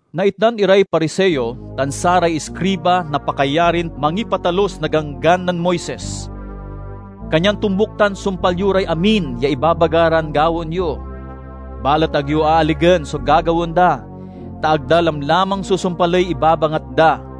"Naitdan iray Pariseo tan saray iskriba na pakayarin mangipatalus na Ganggan nen Moises. Kanyan tombuk tan sumpal yo ray amin ya ibabaga ran gawaen yo. Balet ag yo aaligen so gagawaen da, ta ag da lamlamang susumpaley ibabangat da.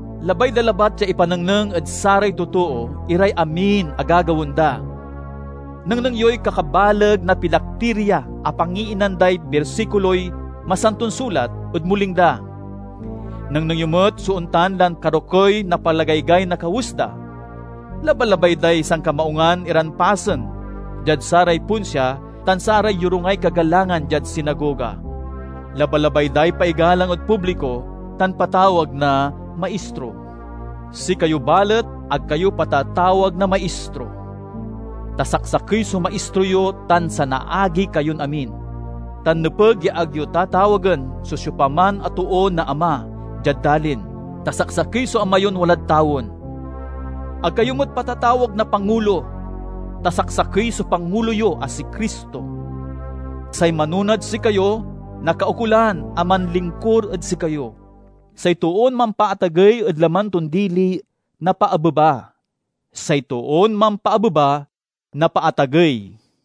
Labay da labat ya ipanengneng ed saray totoo iray amin a gagawaen da. Nengneng yoy kakabaleg na pilaktiria a pangiinan day bersikuloy Masanton Sulat ed muling da! Nengneng yo met so ontan lan karokey na palagaygay na kawes da! Labalabay day sankamaungan iran pasen diad saray ponsia tan saray yorungay kagalangan diad sinagoga. Labalabay day paigalang ed publiko tan patawag na 'Maistro.' Sikayo, balet, ag kayo patatawag na 'Maistro,' ta saksakey so Maistro yo tan sanaagi kayon amin. Tan nepeg ya ag yo tatawagen so siopaman a too na 'Ama' diad dalin, ta saksakey so Ama yon walad tawen. Ag kayo met patatawag na 'Pangulo,' ta saksakey so Pangulo yo a si Cristo. Say manonad sikayo nakaukolan a manlingkur ed sikayo. Say toon mampaatagey ed laman ton dili, napaabeba; say toon mampaabeba, napaatagey."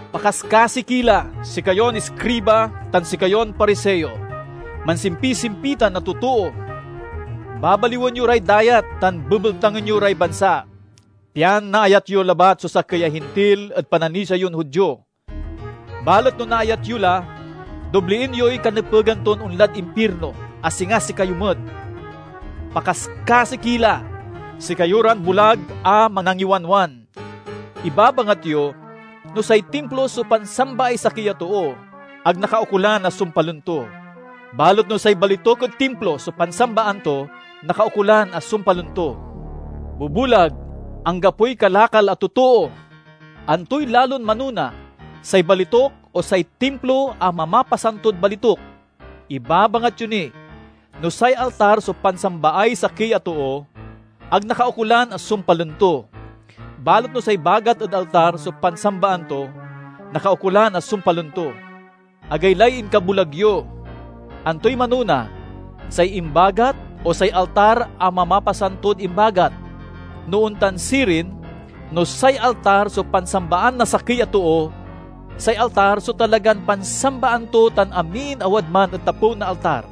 "Pakaskasi ki la, sikayon iskriba tan sikayon Pariseo! Mansimpisimpitan a totoo! Babaliwen yo ray dayat tan bebeltangen yo ray bansa pian naayat yo labat so sakey a Hintil ed pananisia yon Judio. Balet no naayat yo la, doblien yoy kanepegan ton onlad impirno, a singa sikayo met! "Pakaskasi ki la, sikayo ran bulag a manangiwanwan! Ibabangat yo, 'No say Timplo so pansambaay sakey a too, ag nakaukolan a sumpalen to. Balet no say balituk ed Timplo so pansambaan to, nakaukolan a sumpalen to!' Bubulag, anggapoy kalakal a totoo! Antoy lalon manona, say balituk o say Timplo a mamapasantod balituk? Ibabangat yo ni, 'No say altar so pansambaay sakey a too, ag nakaukolan a sumpalen to. Balet no say bagat ed altar so pansambaan to, nakaukolan a sumpalen to.' Agaylay inkabulag yo! Antoy manona, say imbagat o say altar a mamapasantod imbagat? No ontan sirin, no say altar so pansambaan na sakey a too, say altar so talagan pansambaan to tan amin a wadman ed tapew na altar.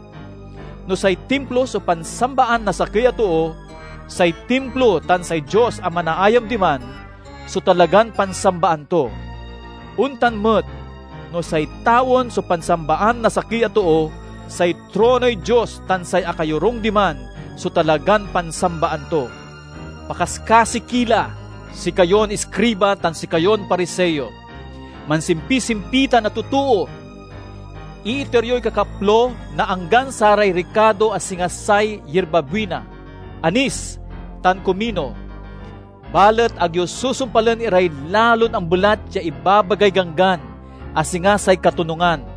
No say Timplo so pansambaan na sakey a too, say Timplo tan say Dios a manaayam diman so talagan pansambaan to. Ontan met, no say tawen so pansambaan na sakey a too, say tronoy Dios tan say akayorung diman so talagan pansambaan to. "Pakaskasi ki la, sikayon iskriba tan sikayon Pariseo! Mansimpisimpitan a totoo! Iiter yoy kakaplo na anggan saray rikado a singa say yirbabuina, anis, tan kumino, balet ag yo susumpalen iray lalon ambelat ya ibabagay Ganggan a singa say katonungan,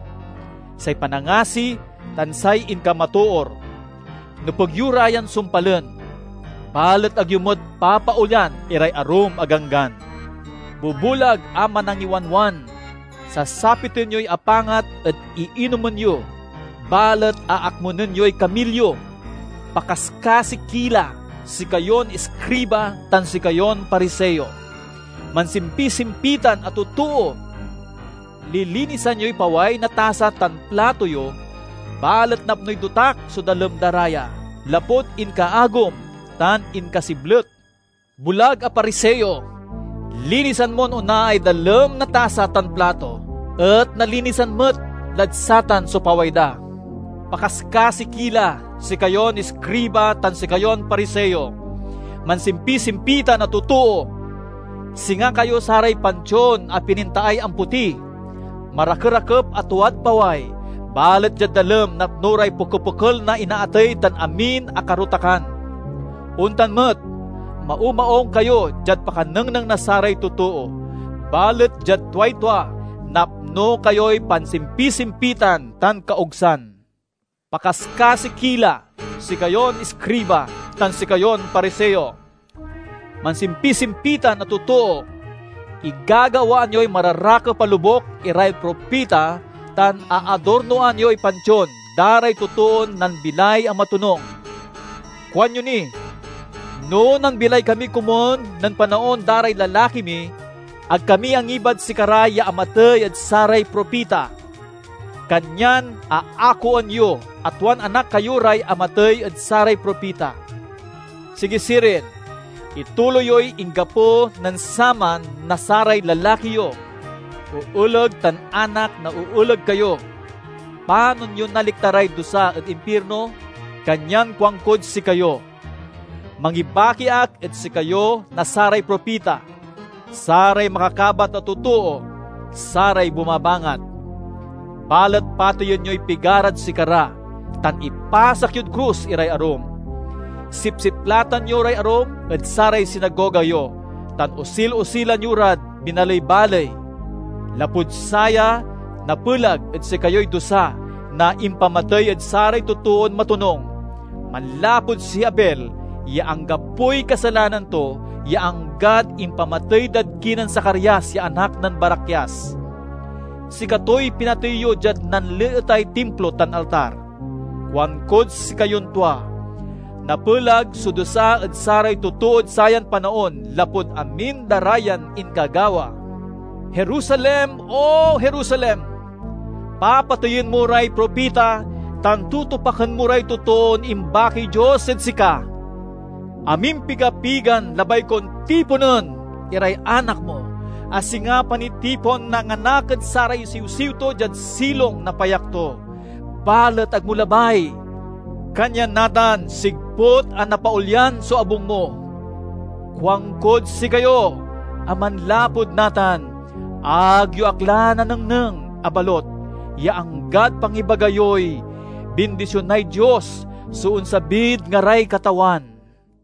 say panangasi, tan say inkamatoor. Nepeg yo ra yan sumpalen, balet ag yo met papaolyan iray arum a ganggan. Bubulag a manangiwanwan! Sasapiten yoy apangat ed iinomen yo, balet aakmunen yoy kamilyo! "Pakaskasi ki la, sikayon iskriba tan sikayon Pariseo! Mansimpisimpitan a totoo! Lilinisan yoy paway na tasa tan plato yo, balet napnoy dotak so dalem da ra ya, lapud inkaagum tan inkasiblet. Bulag a Pariseo! Linisan mon onaay dalem na tasa tan plato, et nalinisan met lad satan so paway da! "Pakaskasi ki la, sikayon iskriba tan sikayon Pariseo! Manisimpisimpitan a totoo! Singa kayo saray pantion a pinintaay ampoti; marakerakep a tuad paway, balet diad dalem napno ray pokepokel na inaatey tan amin a karotakan. Ontan met, maumaung kayo diad pakanengneng na saray totoo, balet diad tuay tua, napno kayoy pansimpisimpitan tan kaogsan." "Pakaskasi ki la, sikayon iskriba tan sikayon Pariseo! Mansimpisimpitan a totoo! Igagawaan yoy mararakep a lobuk iray propita tan aadornoan yoy pantion da ray totoon nambilay a matonung. Kuanyo ni, 'No nambilay kami komun nen panaon da ray lalaki mi, ag kami angibad sikara ya amatey ed saray propita!' Kanyan aakoen yo a tuan anak kayo ray amatey ed saray propita! Sigi sirin, ituloy yoy inggapo nen saman na saray lalaki yo! Ooleg tan anak na ooleg kayo! Panon yon naliktaray dusa ed impirno? Kanyan kuankod sikayo: mangibaki ak ed sikayo na saray propita, saray makakabat a totoo, saray bumabangat. Balet pateyen yoy pigarad sikara, tan ipasak yod krus iray arum. Sipsiplatan yo ray arum ed saray sinagoga yo, tan osil-osilan yo rad binaley-baley. Lapud saya, napelag ed sikayoy dusa na impamatey ed saray totoon matonung, manlapud si Abel ya anggapoy kasalanan to ya anggad impamatey dad kinen Zacarias ya anak nen Barakias. Sikatoy pinatey yo diad nanleetay Timplo tan altar. Kuankod sikayon tua: napelag so dusa ed saray totood sayan panaon lapud amin da ra yan inkagawa!" "Jerusalem, O Jerusalem! Papateyen mo ray propita tan tutupaken mo ray totoon imbakiy Dios ed sika! Amimpiga-pigan labay kon tiponen iray anak mo, a singa panitipon na nganak ed saray siwsiw to diad silong na payak to, balet ag mo labay! Kanyan, natan, sigput a napaolyan so abung mo. Kuankod sikayo, a manlapud natan, ag yo ak la nanengneng a balut ya anggad pangibaga yoy 'Bindisionay Dios so onsabid ngaray Katawan.'"